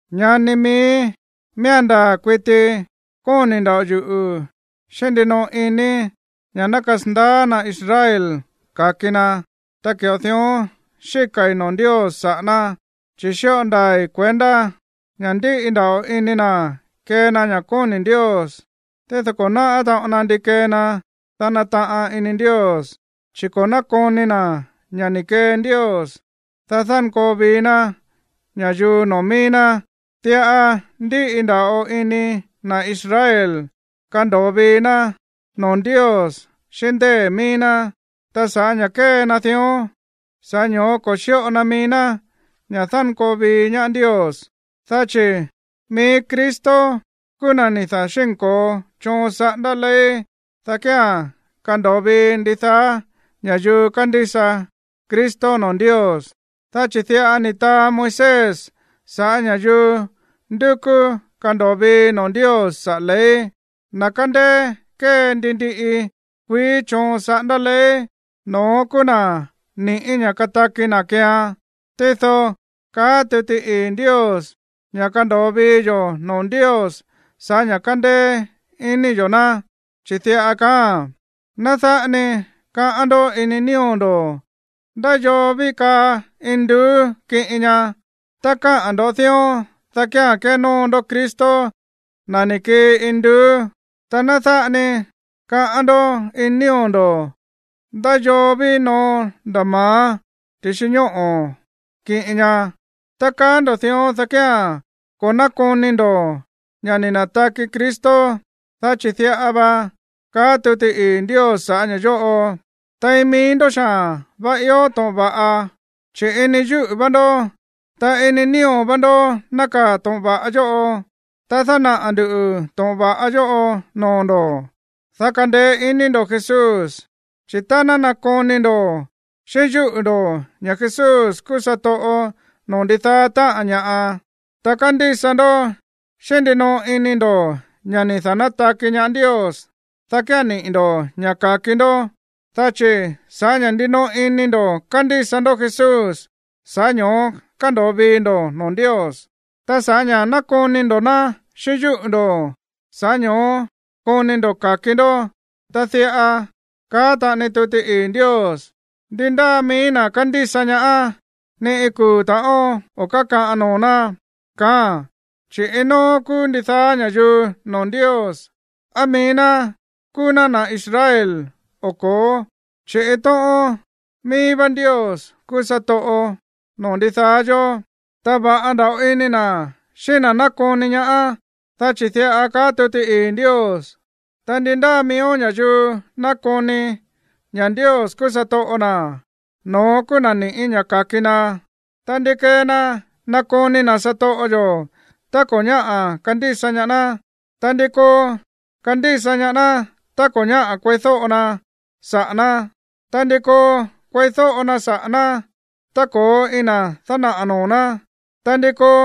Ñani miíí, miía̱n ndaa̱ kuiti kóni̱ nda̱ꞌo yuꞌu̱ xíꞌín ndinoꞌo inii̱ ña̱ ná kasandaá na̱ Israel ka̱ki na, ta ki̱ꞌo dión xíka̱i̱ noo̱ Ndios saꞌa̱ ná. Chi̱ xíꞌo ndaa̱i̱ kuendá ña̱ ndíꞌi nda̱ꞌo ini na̱ kee na ña̱ kóni̱ Ndios, tído ko̱ náꞌá taꞌon na ndi kee na, dá nataꞌan ini Ndios, chi̱ ko̱ nákoni na̱ ña̱ ni̱ kee Ndios, dá dánkoo vii ná ña̱yuu noo̱ mií ná. Diꞌa ndíꞌi nda̱ꞌo ini na̱ Israel kando̱o vii ná noo̱ Ndios xíꞌín ndée̱ míí ná. Ta sa̱ꞌá ña̱ kée na dión, sa̱ꞌá ño̱ó ko̱ xíꞌo na mií ná ña̱ dánkoo vii ñaá Ndios. Dá chi̱ mií Cristo kúú na̱ ni̱ da̱xínko̱o choon saꞌándá ley, dá kía̱n kando̱o vii ndidaá ña̱yuu kándísa Cristo noo̱ Ndios. Dá chi̱ diꞌa ni̱ taa Moisés sa̱ꞌá ña̱yuu ndúkú kando̱o vii noo̱ Ndios saꞌa̱ ley: “Na̱ kándéé kée ndi ndiꞌi kuií choon saꞌándá ley, no̱ón kúú na̱ ni̱ꞌí ña̱ kataki na̱ keean.” Tído káꞌa̱n tuti ii̱ Ndios ña̱ kándo̱o vii yo̱ noo̱ Ndios sa̱ꞌá ña̱ kándéé iní yo̱ ná, chi̱ diꞌa kaáa̱n: “Ná dáꞌa ni kaꞌán ndó ini nío̱ ndo̱: ¿Ndá yoo ví kaa induú kiꞌin ña? (Tá kaá ndo̱ dión, dá kía̱n kénóo ndó Cristo, na̱ ni̱ kii induú.) Ta ná dáꞌa ni kaꞌán ndó ini nío̱ ndo̱: ¿Ndá yoo ví noo nda̱ ma̱á ti̱xi ñóꞌo̱ kiꞌin ña?” (Tá kaá ndo̱ dión, dá kía̱n ko̱ nákoni ndo̱ ña̱ ni̱ na̱taki Cristo.) Dá chi̱ diꞌa va kaá tuti ii̱ Ndios sa̱ꞌá ña̱ yóꞌo: “Tein mií ndó xaa̱n va ió to̱ꞌon va̱ꞌa, chi̱ ini yúꞌu̱ vá ndó, ta ini nío̱ vá ndó nákaa̱ to̱ꞌon va̱ꞌa yóꞌo.” Ta dánaꞌa̱ ndu̱ to̱ꞌon va̱ꞌa yóꞌo noo̱ ndo̱, dá kandeé ini ndo̱ Jesús. Chi̱ tá nákoni ndo̱ xíꞌín yúꞌu̱ ndo̱ ña̱ Jesús kúú satoꞌo noo̱ ndidaá táꞌa̱n ña̱ꞌa, ta kándísa ndó xíꞌín ndinoꞌo ini ndo̱ ña̱ ni̱ da̱nátaki ñaá Ndios, dá kía̱n niꞌi̱ ndo̱ ña̱ ka̱ki ndó. Dá chi̱ sa̱ꞌá ña̱ ndinoꞌo ini ndo̱ kándísa ndó Jesús, sa̱ꞌá ño̱ó kándo̱o vii ndo̱ noo̱ Ndios. Ta sa̱ꞌá ña̱ nákoni ndo̱ ná xíꞌín yúꞌu̱ ndo̱, sa̱ꞌá ño̱ó koni ndo̱ ka̱ki ndó. Ta diꞌa káꞌa̱n taꞌani tuti ii̱ Ndios: “Ndi ndáa mií na̱ kándísa ñaá, ni iin kuu̱ ta̱ꞌón o̱ kákaꞌan noo̱ ná”, kaáa̱n. Chi̱ iin nóó kúú ndidaá ña̱yuu noo̱ Ndios, á mií ná kúú ná na̱ Israel, o ko̱ó, chi̱ iin tóꞌón míí vá Ndios kúú satoꞌo noo̱ ndidaá yó. Ta va̱ꞌa nda̱ꞌo ini na̱ xíꞌín na̱ nákoni ñaá. Dá chi̱ diꞌa kaá tuti ii̱ Ndios: “Ta ndi ndáa miíó ña̱yuu nákoni ña̱ Ndios kúú satoꞌo na̱, no̱ón kúú na̱ ni̱ꞌí ña̱ ka̱ki na.” Ta, ¿ndi kee na nakoni na̱ satoꞌo yo̱ tá ko̱ ñáꞌa̱ kandísa ñaá ná? Ta, ¿ndi koo kandísa ñaá ná tá ko̱ ñáꞌa̱ kueídóꞌo na saꞌa̱ ná? Ta, ¿ndi koo kueídóꞌo na saꞌa̱ ná tá ko̱ íin na̱ dánaꞌa̱ noo̱ ná? Ta, ¿ndi koo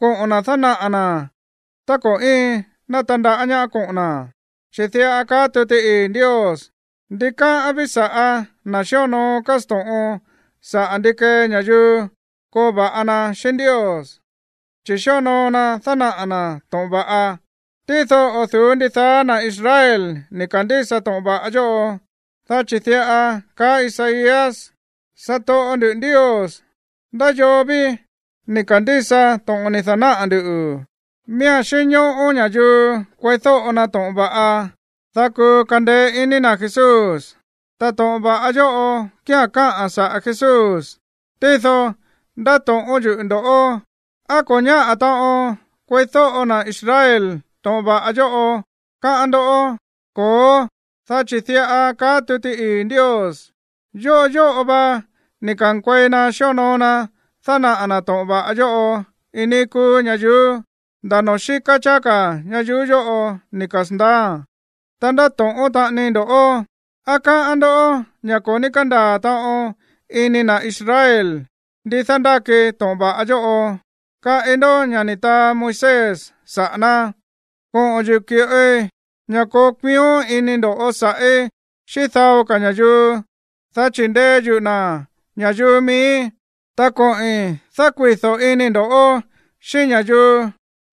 koꞌo̱n na̱ dánaꞌa̱ na̱ tá ko̱ íin na̱ tandaꞌá ñaá koꞌo̱n na̱? Chi̱ diꞌa kaá tuti ii̱ Ndios: “Ndikáꞌán ví sa̱ꞌá na̱ xíonoo kásto̱ꞌon saꞌa̱ ndi kee ña̱yuu koo va̱ꞌa na xíꞌín Ndios, chi̱ xíonoo na dánaꞌa̱ na̱ to̱ꞌon va̱ꞌa.” Tído o̱ du̱ú ndidaá na̱ Israel ni̱ ka̱ndísa to̱ꞌon va̱ꞌa yóꞌo, dá chi̱ diꞌa kaá Isaías: “Satoꞌo ndu̱, Ndios, ¿ndá yoo ví ni̱ ka̱ndísa to̱ꞌon ni̱ da̱náꞌa̱ nduꞌu̱?” Miía̱n xínñóꞌó ña̱yuu kueídóꞌo na to̱ꞌon va̱ꞌa, dá kuu kandeé iní na̱ Jesús, ta to̱ꞌon va̱ꞌa yóꞌo kía̱n káꞌa̱n saꞌa̱ Jesús. Tído ndáto̱ꞌón yuꞌu̱ ndo̱ꞌó: ¿Á ko̱ ñáꞌa̱ taꞌon kueídóꞌo na̱ Israel to̱ꞌon va̱ꞌa yóꞌo, káꞌán ndoꞌó? Ko̱ó, dá chi̱ diꞌa kaá tuti ii̱ Ndios: Yóꞌo yóꞌo va ni̱ ka̱nkuei na xíonoo na dánaꞌa̱ na̱ to̱ꞌon va̱ꞌa yóꞌo iin níí kúú ñayuú, nda̱ noo̱ xíká cháá ka̱ ñayuú yóꞌo ni̱ kasa̱ndaáa̱n. Ta ndáto̱ꞌón taꞌanii ndo̱ꞌó: ¿Á káꞌán ndó ña̱ ko̱ ní kándaa̱ taꞌon ini na̱ Israel ndi dándáki to̱ꞌon va̱ꞌa yóꞌo? Kaꞌi ndó ña̱ ni̱ taa Moisés saꞌa̱ ná: Koꞌo̱n yuꞌu̱ ki̱ꞌoi ña̱ koo kuión ini ndo̱ sa̱ꞌí xíꞌín dao ka̱ ña̱yuu, dá chi̱ ndee yuꞌu̱ na̱ ña̱yuu miíi̱, ta koꞌi̱n dákuido̱ inii̱ ndo̱ꞌó xíꞌín ña̱yuu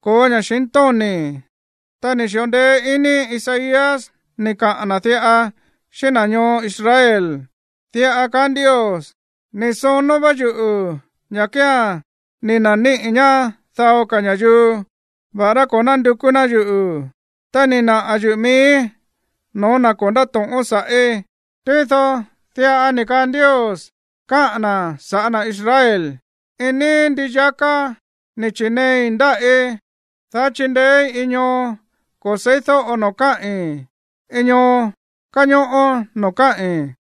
ko̱ó ña̱xintóni̱. Ta ni̱ xi̱ꞌo ndeé iní Isaías ni̱ kaꞌa̱n na̱ diꞌa xíꞌín na̱ ñoo Israel: Diꞌa kaá Ndios: Ni̱ sonó vá yuꞌu̱ ña̱ kía̱n ni̱ na̱níꞌi̱ ñaá dao ka̱ ña̱yuu, va̱ꞌará ko̱ nándukú ná yuꞌu̱, ta ni̱ naꞌa̱ yuꞌu̱ miíí no̱ó na̱ ko̱ ndáto̱ꞌón sa̱ꞌí. Tído diꞌa ni̱ kaa Ndios káꞌa̱n na̱ sa̱ꞌá na̱ Israel: “Iin níí ndii yaká ni̱ chi̱neei ndáꞌí, dá chindeéí iin ñoo ko̱ se̱ídóꞌo noo̱ káꞌi̱n, iin ñoo káñóꞌó noo̱ káꞌi̱n.”